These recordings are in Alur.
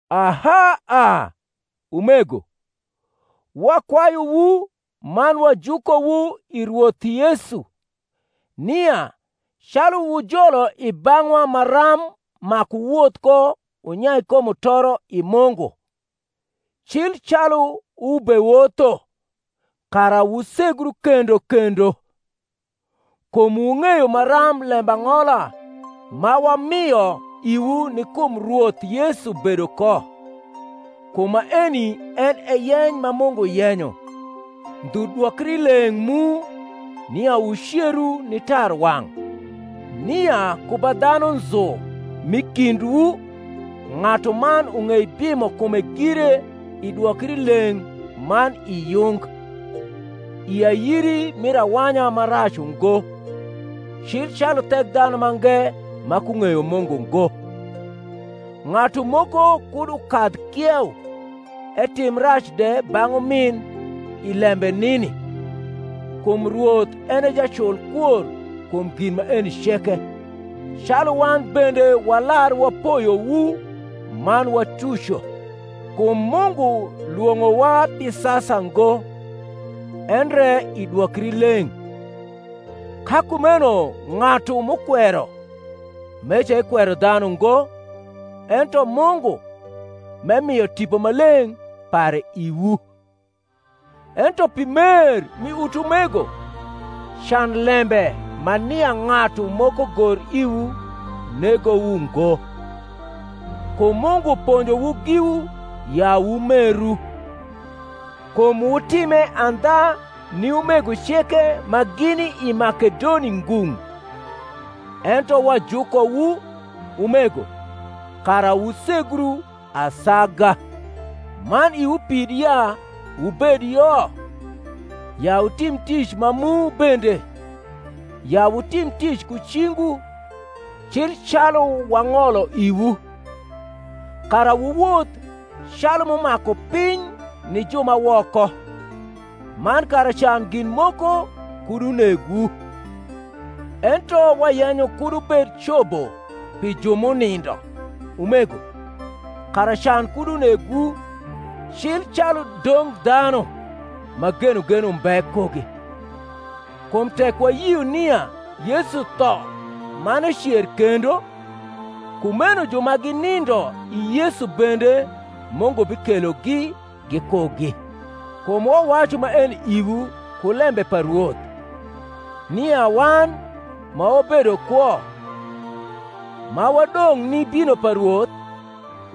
Aha a, umego, wakwayuwu man wajukowu i Rwoth Yesu, nia, calu wu jolo i bang’wa maram maku wuwoth ko wunyai ko mutoro Mungu, cil wubewotho, kara wusegru kendo kendo. Kum wung’eyo maram lembang’ola ma wamio iwu ni kum Rwoth Yesu bedo ko. Kum maeni en e yeny ma Mungu yenyo, ndhu dwokrileng’ mu, nia wuceru ni tarwang’; nia ku ba dhanu nzu m’i kindwu ng’atuman ung’ei bimo kume gire i dwokrileng’ man i yung, i ayiri mir awanya ma rac ungo, cil calu Thekdhanumange ma kung’eyo Mungu ngo; ng’atu moko kud ukadh kieu, etim rac de bang’ umin i lembe nini: kum Rwoth en e jacul kwor kum gin maeni ceke, calu wan bende walar wapoyowu man watuco. Kum Mungu lwong’owa pi sasa ngo, endre i dwokrileng’. Ka kumeno ng’atu m’ukwero, meca ekwero dhanu ngo, ento Mungu, m’emio Tipo Maleng’ pare iwu. Ento pi mer mi utumego can lembe ma nia ng’atu moko gor iwu negowu ngo: kum Mungu ponjowu giwu ya wumeru; kum wutime andha ni umego ceke ma gini i Makedoni ngung’. Ento wajukowu, umego, kara wusegru asaga; man iwu pid ya wubed yo, ya wutim tic ma mu bende, ya wutim tic ku cingwu, cil calu wang’olo iwu; kara wuwoth calu m’umaku piny ni ju ma woko, man kara can gin moko kud unegwu. Ento wayenyo kud wubed cobo pi ju m’unindo, umego; kara can kud unegwu, cil calu dong dhanu, ma genogen umbe kugi. Kum tek wayio nia Yesu tho man ecer kendo, kumeno ju ma ginindo i Yesu bende Mungu bikelogi gikugi. Kum wawacu maeni iwu ku lembe pa Rwoth, nia wan ma wabedo kwo, ma wadong’ ni bino pa Rwoth,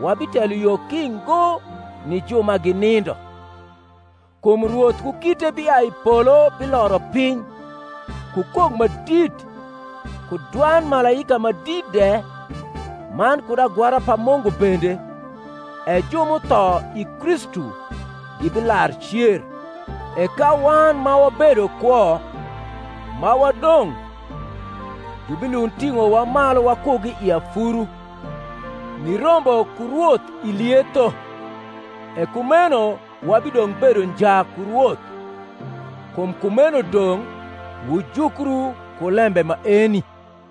wabitelo yo ki ngo ni ju ma ginindo. Kum Rwoth ku kite biai i polo biloro piny, ku kok ma dit, ku dwand malaika ma dit de, man kud agwara pa Mungu bende: e ju m’utho i Kristu gibilar cer; e ka wan ma wabedo kwo, ma wadong’, jubilund ting’owa malu wakugi i afuru, nirombo ku Rwoth i lietho; e kumeno wabidong’ bedo nja ku Rwoth. Kum kumeno dong’ wujukru ku lembe maeni.